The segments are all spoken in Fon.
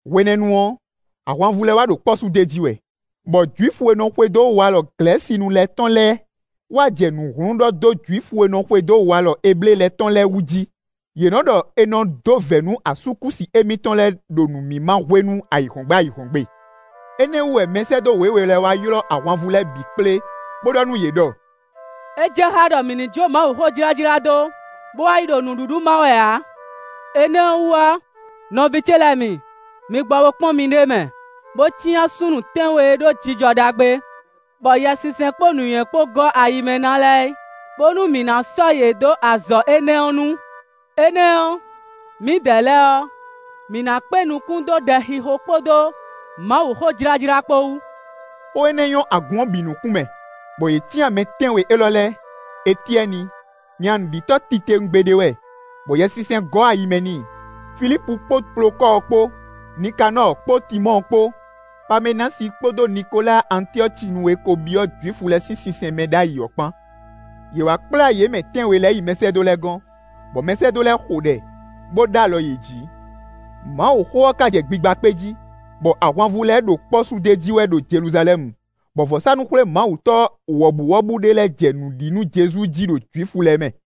Hwenɛ́nu ɔ́, ahwanvú lɛ́ɛ wá ɖo kpɔ́ sú d'é jí wɛ, bɔ Jwifu e nɔ xwedó walɔ Glɛ̌sinu lɛ́ɛ tɔn lɛ́ɛ wá jɛ nǔ hlún ɖɔ dó Jwifu e nɔ xwedó walɔ Eblée lɛ́ɛ tɔn lɛ́ɛ wú jí. Yě nɔ́ ɖɔ è nɔ dó vɛ̌ nú asúkúsi émítɔn lɛ́ɛ ɖo nǔmímá hwenu ayǐhɔ́ngbe ayǐhɔ́ngbe. Énɛ́ wú wɛ mɛsɛ́dó wěwe lɛ́ɛ wá ylɔ́ ahwanvú lɛ́ɛ bǐ kplé, bó ɖɔ nú yě ɖɔ: “É jɛ xá ɖɔ mǐ ní jó Mawuxó jlájlá dó, bó wá yi ɖo nǔɖuɖu má wɛ ǎ. Énɛ́ ɔ́ wú ɔ́, nɔví ce lɛ́ɛ mi, mi gbɔ bo kpɔ́n miɖée mɛ, bó cyán súnnu tɛ́nwe e ɖó jijɔ ɖagbe, bɔ Yɛsinsɛn kpó nǔnywɛ́ kpó gɔ́ ayi mɛ ná lɛ́ɛ é, bónú mǐ ná sɔ́ yě ɖó azɔ̌ énɛ́ ɔ́ nu. Énɛ́ ɔ́, mǐdɛɛ lɛ́ɛ ɔ́, mǐ ná kpé nukún dó ɖɛxixo kpódó Mawuxó jlájlá kpó wú.” Xó énɛ́ nyɔ́ agun ɔ́ bǐ nukún mɛ, bɔ yě cyán mɛ tɛ́nwe élɔ́ lɛ́ɛ: Etyɛ́ni, nya nǔɖitɔ́ titewungbe ɖé wɛ, bɔ Yɛsinsɛn gɔ́ ayi mɛ n'i; Filípu kpó Plokɔ́ɔ kpó, Nikanɔ́ɔ kpó Timɔ́ɔ kpó, Pamɛnási kpódó Nikoláa Antyɔ́cinu e ko byɔ́ Jwifu lɛ́ɛ sín sinsɛn mɛ ɖ'ayǐ ɔ́ kpán. Yě wá kplá yě mɛ tɛ́nwe lɛ́ɛ yi mɛsɛ́dó lɛ́ɛ gɔ́n, bɔ mɛsɛ́dó lɛ́ɛ xo ɖɛ, bó ɖó alɔ yě jí. Mawuxó ɔ́ ka jɛ gbigba kpé jí, bɔ ahwanvú lɛ́ɛ ɖo kpɔ́ sú d'é jí wɛ ɖo Jeluzalɛ́mu, bɔ vɔ̌sánú-xwlémawutɔ́ wɔ̌buwɔ́bú ɖé lɛ́ɛ jɛ nǔ ɖi nú Jezu jí ɖo Jwifu lɛ́ɛ mɛ.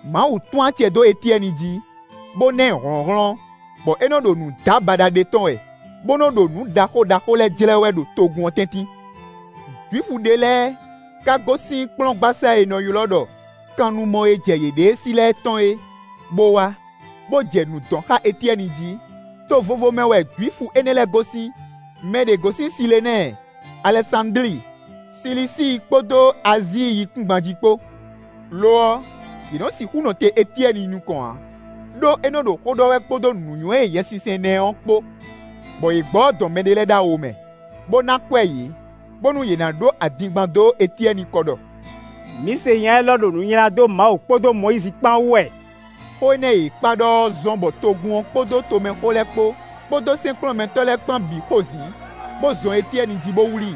Mawu tún acɛ dó Etyɛ́ni jí, bó ná ɛ hlɔ̌nhlɔ́n, bɔ é nɔ́ ɖo nǔdábaɖa ɖe tɔ́n wɛ, bó nɔ́ ɖo nǔ ɖaxó ɖaxó lɛ́ɛ jlɛ́ wɛ ɖo togun ɔ́ tɛ́ntin. Jwifu ɖé lɛ́ɛ ka gosín kplɔ́ngbasá e è nɔ ylɔ́ ɖɔ “Kannumɔ e jɛ yěɖée sí lɛ́ɛ tɔn é” bó wá, bó jɛ nǔ dɔn xá Etyɛ́ni jí; to vovo mɛ wɛ Jwifu énɛ́ lɛ́ɛ gosín; mɛ ɖě gosín Silenɛ́ɛ, Alɛsándli, Silisíi kpódó Azíi yíkúngban jí kpó. Lo ɔ́, yě nɔ́ sixú nɔ te Etyɛ́ni nukɔn ǎ, ɖó é nɔ́ ɖo xó ɖɔ wɛ kpódó nǔnywɛ́ e Yɛsinsɛn ná ɛ ɔ́ kpó. Bɔ yě gbɔ bó dɔn mɛɖé lɛ́ɛ dó awo mɛ, bó ná akwɛ́ yě, bónú yě ná ɖó adingban dó Etyɛ́ni kɔ ɖɔ: “Mǐ se nya élɔ́ ɖo nu nylá dó Mawu kpódó Mɔyízi kpán wú wɛ.” Xó énɛ́ e yě kpá ɖɔ ɔ́ zɔ́n bɔ togun ɔ́ kpódó tomɛxó lɛ́ɛ kpó, kpódó sɛ́nkplɔ́nmɛtɔ́ lɛ́ɛ kpán bǐ xo zǐn, bó zɔn Etyɛ́ni jí bó wlí,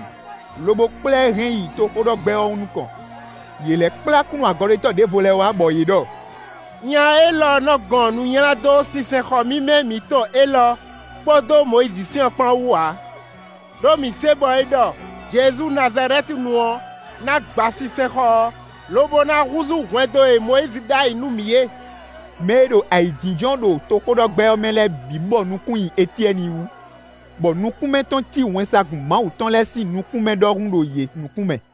lobo kplá ɛ hɛn yi toxóɖɔgbɛ́ ɔ́ nukɔn. Yě lɛ́ kplá kúnnu-agɔɖetɔ́ ɖěvo lɛ́ɛ wá, bɔ yě ɖɔ: “Nya élɔ́ nɔ́ gɔn nu nylá dó sinsɛnxɔ mímɛ́ mǐtɔn élɔ́ kpódó Mɔyízi sɛ́n ɔ́ kpán wú ǎ. Đó mǐ se bɔ é ɖɔ Jezu Nazalɛ́tinu ɔ́ ná gba sinsɛnxɔ ɔ́, lobo ná húzú hwɛndo e Mɔyízi ɖó ayǐ nú mǐ é.” Mɛ e ɖo ayǐjínjɔ́n ɖo toxóɖɔgbɛ́ ɔ́ mɛ lɛ́ɛ bǐ bɔ nukún nyi Etyɛ́ni wú, bɔ nukún mɛ tɔn cí wɛnsagun Mawu tɔn lɛ́ɛ sín nukún mɛ ɖɔhun ɖo yě nukún mɛ.